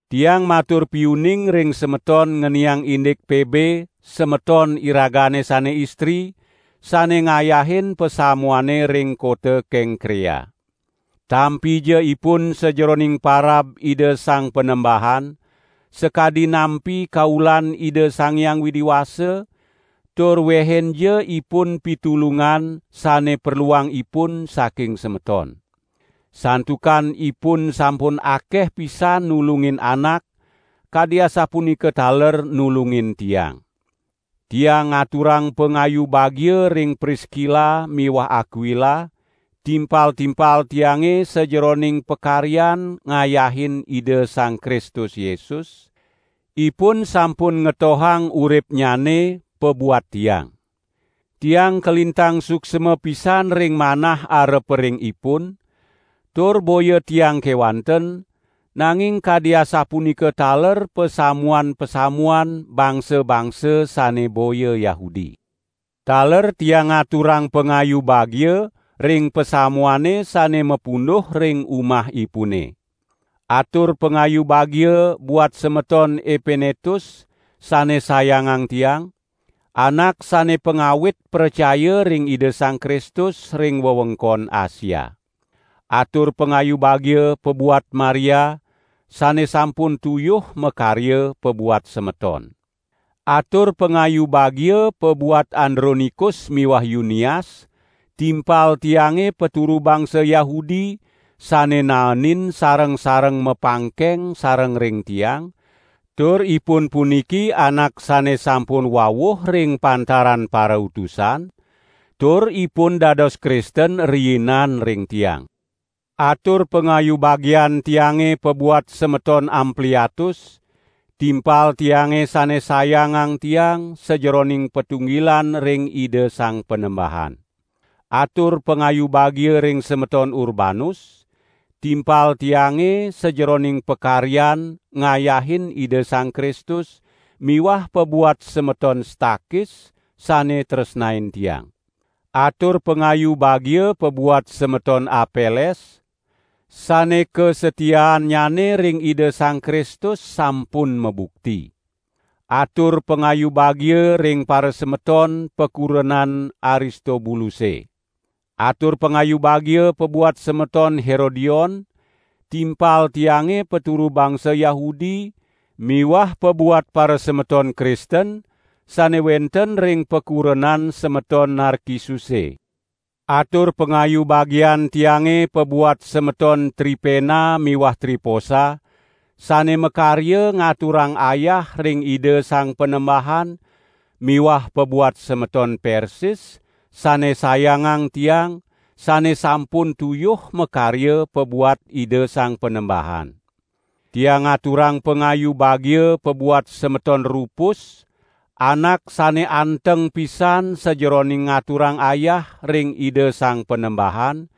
Tiang matur piuning ring semeton ngeniang indik: Pebe, semeton iragane sane istri, sane ngayahin pasamuane ring kota Kengkrea. Tampija ipun sajeroning parab Ida Sang Panembahan, sakadi nampi kaulan Ida Sang Hyang Widi Wasa, tur wehinja ipun pitulungan sane perluang ipun saking semeton. Santukan ipun sampun akeh pisan nulungin anak, kadi asapunika taler nulungin tiang. Tiang ngaturang pangayu bagia ring Priskila miwah Akwila, timpal-timpal tiange sajeroning pakaryan ngayahin Ida Sang Kristus Yesus, ipun sampun ngetohang uripnyane pabuat tiang. Tiang kalintang suksma pisan ring manah arepa ring ipun, tur boya tiang kewanten, nanging kadi asapunika taler pasamuan-pasamuan bangsa-bangsa sane boya Yahudi. Taler tiang ngaturang pangayu bagia ring pasamuane sane mapunduh ring umahipune. Atur pangayu bagia buat semeton Epenetus sane sayangang tiang, anak sane pangawit pracaya ring Ida Sang Kristus ring wewengkon Asia. Atur pangayu bagia pabuat Maria, sane sampun tuyuh makarya pabuat semeton. Atur pangayu bagia pabuat Andronikus miwah Yunias, timpal tiange paturu bangsa Yahudi sane naenin sareng-sareng mapangkeng sareng ring tiang, tur ipun puniki anak sane sampun wawuh ring pantaran parautusan, tur ipun dados Kristen riinan ring tiang. Atur pangayu bagian tiange pabuat semeton Ampliatus, timpal tiange sane sayangang tiang sajeroning patunggilan ring Ida Sang Panembahan. Atur pangayu bagia ring semeton Urbanus, timpal tiange sajeroning pakaryan ngayahin Ida Sang Kristus miwah pabuat semeton Stakis, sane tresnain tiang. Atur pangayu bagia pabuat semeton Apeles, sane kasatiaannyane ring Ida Sang Kristus sampun mabukti. Atur pangayu bagia ring parasemeton pakurenan Aristobuluse. Atur pangayu bagia pabuat semeton Herodion, timpal tiange paturu bangsa Yahudi miwah pabuat parasemeton Kristen sane wenten ring pakurenan semeton Narkisuse. Atur pangayu bagian tiange pabuat semeton Tripena miwah Triposa sane makarya ngaturang ayah ring Ida Sang Panembahan miwah pabuat semeton Persis sane sayangang tiang sane sampun tuyuh makarya pabuat Ida Sang Panembahan. Tiang ngaturang pangayu bagia pabuat semeton Rupus, anak sane anteng pisan sajeroning ngaturang ayah ring Ida Sang Panembahan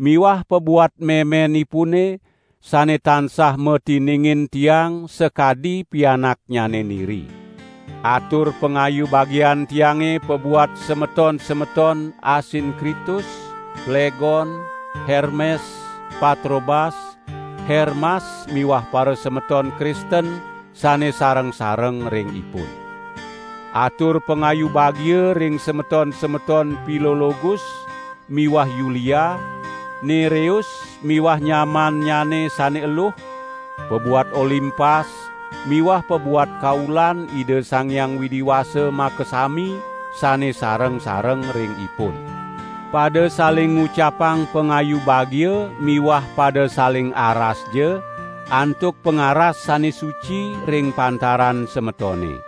miwah pabuat memenipune, sane tansah matiningin tiang sakadi pianaknyane niri. Atur pangayu bagian tiange pabuat semeton-semeton Asinkritus, Plegon, Hermes, Patrobas, Hermas miwah parasemeton Kristen sane sareng-sareng ring ipun. Atur pangayu bagia ring semeton-semeton Pilologus miwah Yulia, Nereus miwah nyamannyane sane eluh, pabuat Olimpas miwah pabuat kaulan Ida Sang Hyang Widi Wasa makasami sane sareng-sareng ring ipun. Pada saling ngucapang pangayu bagia miwah pada saling arasja antuk pangaras sane suci ring pantaran semetone.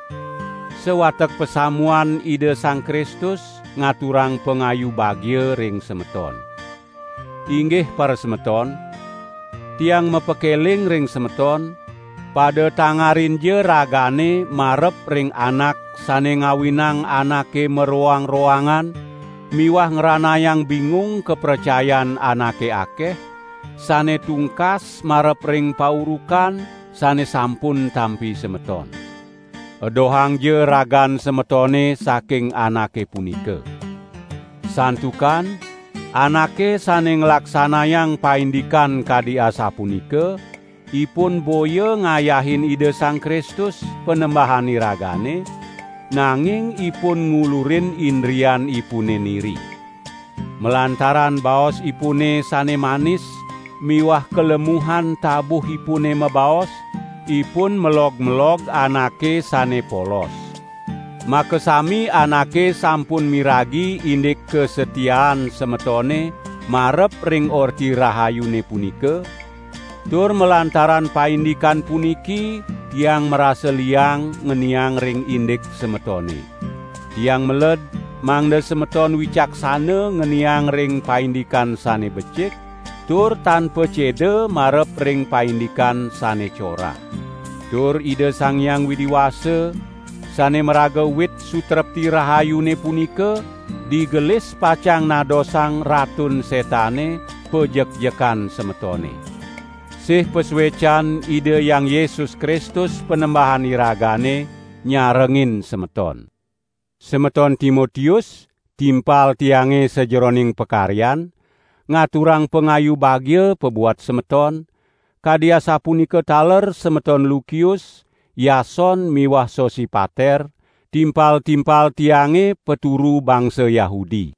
Sawatek pasamuan Ida Sang Kristus ngaturang pangayu bagia ring semeton. Inggih parasemeton, tiang mapakeling ring semeton; pada tangarinja ragane marep ring anak sane ngawinang anake maroang-roangan miwah ngranayang bingung kapracayan anake akeh, sane tungkas marep ring paurukan sane sampun tampi semeton. Edohangja ragan semetone saking anake punika. Santukan anake sane nglaksanayang paindikan kadi asapunika, ipun boya ngayahin Ida Sang Kristus, Panembahan iragane, nanging ipun ngulurin indrianipune niri. Malantaran baosipune sane manis miwah kalemuhan tabuhipune mabaos, ipun melog-melog anake sane polos. Makasami anake sampun miragi indik kasatiaan semetone marep ring Orti Rahayune punika, tur malantaran paindikan puniki tiang marasa liang ngeniang ring indik semetone. Tiang meled mangda semeton wicaksana ngeniang ring paindikan sane becik, tur tan paceda marep ring paindikan sane corah. Tur Ida Sang Hyang Widi Wasa, sane maraga wit sutrepti rahayune punika, digelis pacang nadosang Ratun Setane pajekjekan semetone. Sih pasuecan Ida Hyang Yesus Kristus Panembahan iragane nyarengin semeton. Semeton Timotius, timpal tiange sajeroning pakaryan, ngaturang pangayu bagia pabuat semeton; kadi asapunika taler semeton Lukius, Yason miwah Sosipater, timpal-timpal tiange paturu bangsa Yahudi.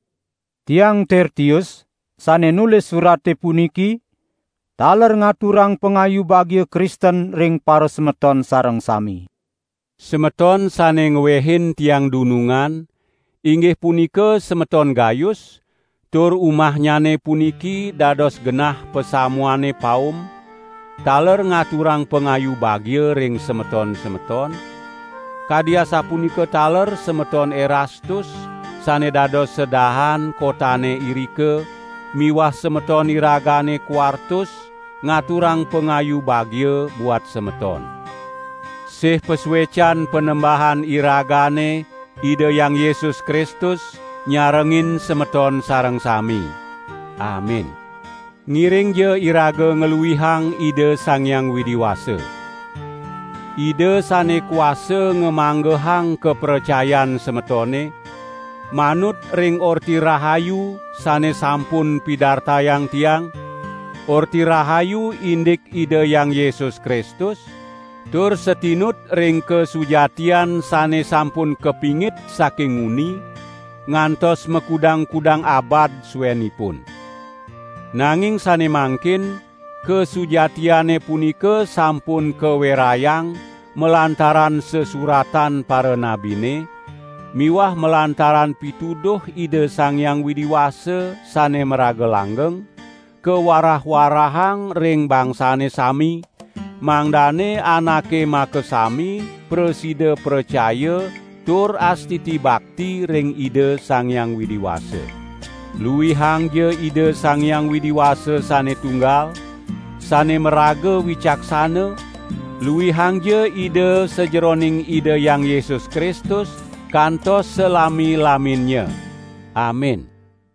Tiang Tertius, sane nulis surate puniki, taler ngaturang pangayu bagia Kristen ring parasemeton sareng sami. Semeton sane ngwehin tiang dunungan, inggih punika semeton Gayus, tur umahnyane puniki dados genah pasamuane paum, taler ngaturang pangayu bagia ring semeton-semeton; kadi asapunika taler semeton Erastus sane dados sedahan kotane irika miwah semeton iragane Kwartus, ngaturang pangayu bagia buat semeton. [ Sih pasuecan Panembahan iragane Ida Hyang Yesus Kristus nyarengin semeton sareng sami. Amin.] Ngiringja iraga ngluihang Ida Sang Hyang Widi Wasa. Ida sane kuasa ngamanggehang kapracayan semetone, manut ring Orti Rahayu sane sampun pidartayang tiang, Orti Rahayu indik Ida Hyang Yesus Kristus, tur satinut ring kasujatian sane sampun kapingit saking nguni, ngantos makudang-kudang abad suenipun. Nanging sane mangkin kasujatiane punika sampun kawerayang malantaran sesuratan paranabine; miwah malantaran pituduh Ida Sang Hyang Widi Wasa sane maraga langgeng; kawarah-warahang ring bangsane sami, mangdane anake makasami prasida pracaya tur astiti bakti ring Ida Sang Hyang Widi Wasa. Luihangja Ida Sang Hyang Widi Wasa sane tunggal, sane maraga wicaksana, luihangja Ida sajeroning Ida Hyang Yesus Kristus kantos salami-laminnya! Amin.